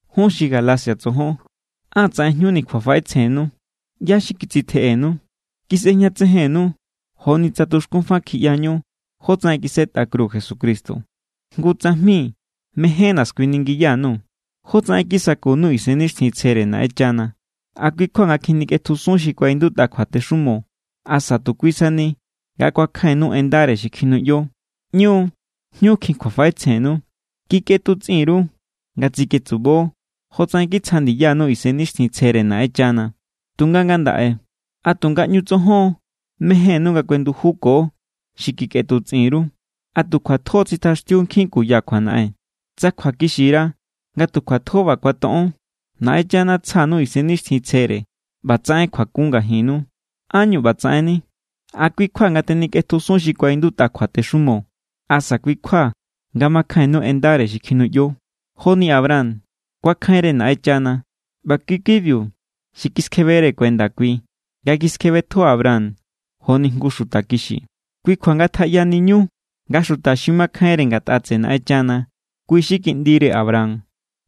Jun xi Galacia tsojon, ¡á tsaꞌen jñuni kjuafaꞌetsjennu! ¿ꞌYá= xi kitsitjeꞌenu? Kisꞌejñatsejennu joni tsa tuxkún fa kjiꞌyañú jótsaꞌen kisꞌetꞌa kru Jesucristo. Jngu tsajmi mejénna̱ skuiningiya_nuu̱: ¿Jótsaꞌen kisakunu Isennixtjintsjere Naꞌenchana? ¿A kui= kjua nga kjinikꞌetjusun xi kuaꞌindutꞌa kjuatexumo? ¿Asa tu kui sani nga kuakjainnu en ndare xi kjinuꞌyo? ¡ꞌÑu= jñukjin kjuafaꞌetsjennu! Kikꞌetutsꞌin_ru nga tsiketsubo jotsaꞌen kitsja ndiyanu Isennixtjintsjere Naꞌenchana. Tunga ngandaꞌe, ¿a tu ngaꞌñu tsojon= mejénnu nga kuendujuko xi kikꞌetutsꞌin_ru? ¿A tu kjuatjo= tsitjaxtiu nkjin kuya kjuanaꞌen? Tsa kjuakixira nga tu kjuatjo ꞌba kuatoꞌon. Naꞌenchana tsja_nuu̱ Isennixtjintsjere ꞌba tsaꞌen kjuakun ngajinnu. ¿Ánñu ꞌba tsaꞌenni? ¿A kui= kjua nga tenikꞌetjusun xi kuaꞌindutꞌa kjuatexumo? ¿Asa kui= kjua nga makjainnu en ndare xi kjinuꞌyo? Joni Abraham, kuakjainre Naꞌenchana ꞌba kui= kibiu xi kiskjebere kuenda kui nga kiskjebetjo Abraham joni jngu xuta kixi. Kui kjua ngatjaꞌyaniñu nga xuta xi makjainre ngatꞌa tseꞌe Naꞌenchana, kui xi kiꞌndire Abraham.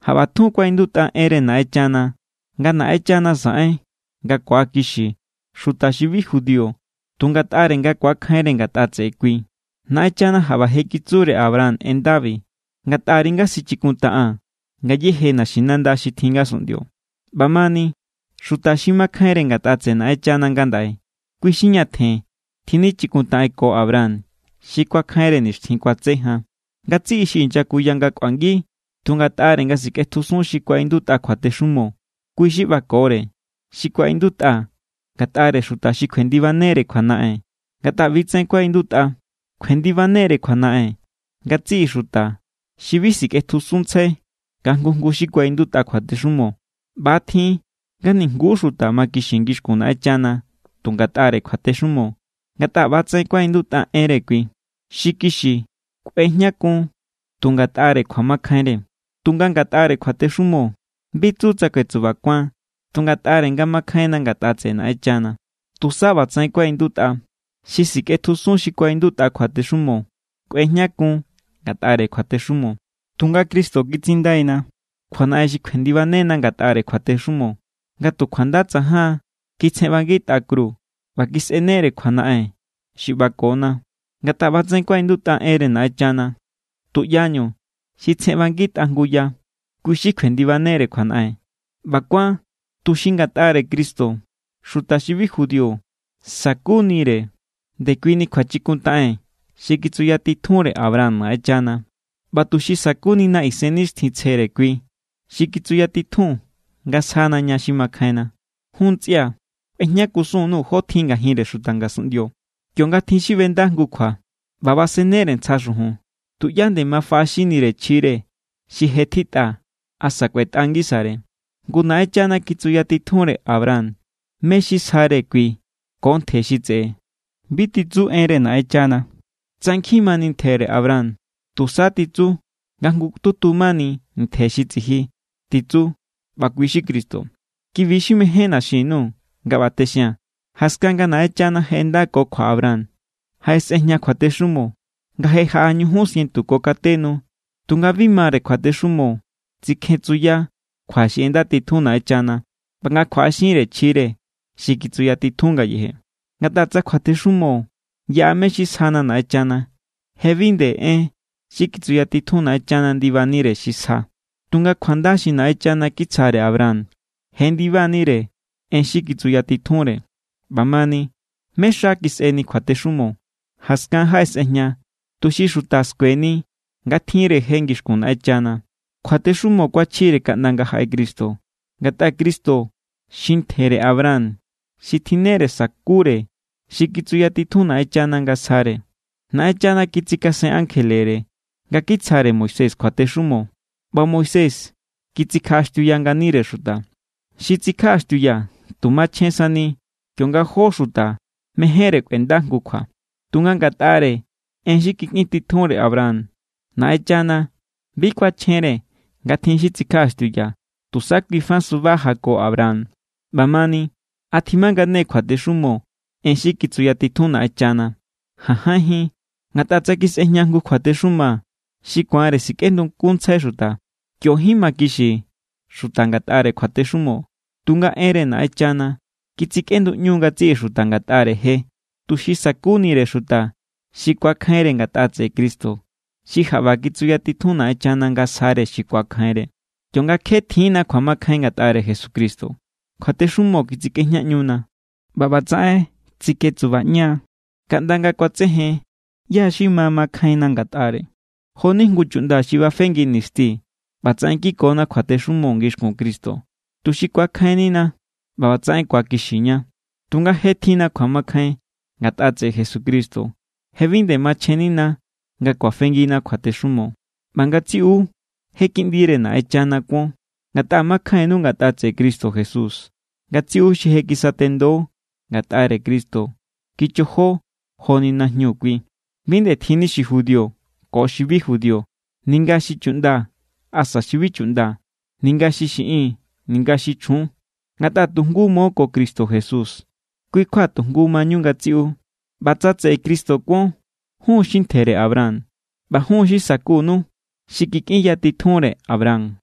Jaꞌba tjun kuaꞌindutꞌa enre Naꞌenchana nga Naꞌenchana saꞌen nga ku̱akixi xuta xi bi judío tu ngatꞌare nga ku̱akjainre ngatꞌa tseꞌe kui. Naꞌenchana jaꞌba je kitsure Abraham en ndabi: “Ngatꞌari nga sichikuntaꞌaa̱n ngayéje naxinanda xi tjin ngasunꞌndio.” ꞌBamani, xuta xi makjainre ngatꞌa tseꞌe Naꞌenchana ngandaꞌe, kui xi ñatjen tjinichikuntaꞌenko Abraham xi kuakjainre nixtjin kuatse jan. Ngatsiꞌi xi inyakuya nga kꞌuangi tu ngatꞌare nga sikꞌetjusun xi kuaꞌindutꞌa kjuatexumo, kui xi ꞌbakore xi kuaꞌindutꞌa ngatꞌare xuta xi kjuendibanere kjuanaꞌen. Ngatꞌa ꞌbi= tsaꞌen kuaꞌindutꞌa: “Kjuendibanere kjuanaꞌen ngatsiꞌi xuta xi bi sikꞌetjusunntsjai nga jngu jngu xi kuaꞌindutꞌa kjuatexumo.” ꞌBa=tjin nga nijnguú xuta makixi ngixkun Naꞌenchana tu ngatꞌare kjuatexumo. Ngatꞌa ꞌba=tsaꞌen kuaꞌindutꞌa enre kui: “Xi kixi, kꞌuejñakun tu ngatꞌare kjuamakjainre.” Tunga ngatꞌare kjuatexumo, bi tsu tsa kuetsubakuan tu ngatꞌare nga makjainna ngatꞌa tseꞌe Naꞌenchana. Tusa ꞌba tsaꞌen kuaꞌindutꞌa: “Xi sikꞌetjusun xi kuaꞌindutꞌa kjuatexumo, kꞌuejñakun ngatꞌare kjuatexumo.” Tunga Cristo kitsindaina kjuanaꞌen xi kjuendibanena ngatꞌare kjuatexumo. Nga tu kjuanda tsajan kitsjenꞌbangitꞌa kru ꞌba kisꞌenere kjuanaꞌen xi ꞌbakona. Ngatꞌa ꞌba tsaꞌen kuaꞌindutꞌa enre Naꞌenchana: “Tuꞌyañu xi tsjenꞌbangitꞌa jngu ya, kui xi kjuendibanere kjuanaꞌen.” ꞌBa kuán tuxi ngatꞌare Cristo xuta xi bi judío sa̱kunire ndekuini kjuachikuntaꞌen xi kitsuyatitjunre Abraham Naꞌenchana, ꞌba tuxi sa̱kunina Isennixtjintsjere kui xi kitsuyatitjun nga sjana ña xi makjainna. Jun ntsꞌia̱, kꞌuejñakusun_nuu̱ jotjin ngajinre xuta ngasunꞌndio. Kionga tjin xi ꞌbenda jngu kjua ꞌba basennere ntsja xujun, tuꞌyá nde ma faꞌaxinnire chjire xi je tjitꞌa asa kꞌuetꞌa ngisare. Ngu, Naꞌenchana kitsuyatitjunre Abraham mé= xi sjare kui ko ntje xi tseꞌe. Bi titsu enre Naꞌenchana tsa nkjin mani ntjere Abraham. Tusa titsu nga jngututu mani. “Ntje xi tsiji”, titsu. ꞌBa kui xi Cristo. Kibi= xi mejénna̱ xin_nuu̱ nga ꞌba texia̱n. Jaskan nga Naꞌenchana je ꞌendako kjua Abraham, jaꞌesꞌejña kjuatexumo, nga je jaꞌa ñujun sientu ko kate nu. Tunga bi mare kjuatexumo tsikjetsunya kjua xi ꞌendatitjun Naꞌenchana ꞌba nga kjuaꞌaxinre chjire xi kitsuyatitjun ngayeje. Ngatꞌa tsa kjuatexumo yaꞌa mé= xi sjana Naꞌenchana, je bi nde en xi kitsuyatitjun Naꞌenchana ndibanire xi sja. Tunga kjuanda xi Naꞌenchana kitsjare Abraham jendiba=nire en xi kitsuyatitjunre. ꞌBamani, ¿mé= xa kisꞌeni kjuatexumo? Jaskan jaꞌesꞌejña, tuxi xuta skueni nga tjinre je ngixkun Naꞌenchana. Kjuatexumo kuachjire kaꞌnda nga jaꞌe Cristo. Ngatꞌa Cristo xi ntjere Abraham xi tjinnere sa̱kure xi kitsuyatitjun Naꞌenchana nga sjare. Naꞌenchana kitsikasen ankjelere nga kitsjare Moisés kjuatexumo, ꞌba Moisés kitsikjaꞌaxtiuya nganire xuta. Xi tsikjaꞌaxtiuya tu machjen sani kionga jó xuta mejénre kꞌuenda jngu kjua. Tunga ngatꞌare en xi kikꞌin titjunre Abraham, Naꞌenchana bi kuachjenre nga tjin xi tsikjaꞌaxtiuya, tusa kui fa suba jako Abraham. ꞌBamani, ¿a tjimangane= kjuatexumo en xi kitsuyatitjun Naꞌenchana? ¡Jajainjín! Ngatꞌa tsa kisꞌejña jngu kjuatexuma xi ku̱anre sikꞌendukunntsjai xuta, kiojín makixi xuta ngatꞌare kjuatexumo. Tunga enre Naꞌenchana kitsikꞌenduꞌñu ngatsiꞌi xuta ngatꞌare je, tuxi sa̱kunire xuta xi ku̱akjainre ngatꞌa tseꞌe Jesucristo xi jaꞌba kitsuyatitjun Naꞌenchana nga sjare xi ku̱akjainre. Kionga kje tjiínna kjuamakjain ngatꞌare Jesucristo, kjuatexumo kitsikꞌejñaꞌñuna. ꞌBa ꞌbatsaꞌen tsiketsubaꞌña= kaꞌnda nga kuatsejen ꞌyá= xi ma mankjainna ngatꞌare. Jo=ni jngu chuꞌnda xi bafengi nisti, ꞌbatsaꞌen kikona kjuatexumo ngixkun Cristo, tuxi ku̱akjainnina ꞌba ꞌbatsaꞌen ku̱akixiña. Tunga je tjinna kjuamakjain ngatꞌa tseꞌe Jesucristo. Je bi nde machjennina nga kuafengina kjuatexumo. ꞌBa ngatsiꞌu, je kiꞌndire Naꞌenchana kuon, ngatꞌa makjainnu ngatꞌa tseꞌe Cristo Jesús. Ngatsiꞌu xi je kisatendo ngatꞌare Cristo kichojo joni najñu Kui. Bi nde tjinni xi judío ko xi bi judío, ninga xi chuꞌnda asa xi bi chuꞌnda, ninga xi xiꞌin, ninga xi chjun. Ngatꞌa tu jngu mo ko Cristo Jesús, kui kjua tu jngu mañu ngatsiꞌu. ꞌBa tsa tseꞌe Cristo kuon, jun= xi ntjere Abraham, ꞌba jun= xi sa̱kunu xi kikꞌinyatitjunre Abraham.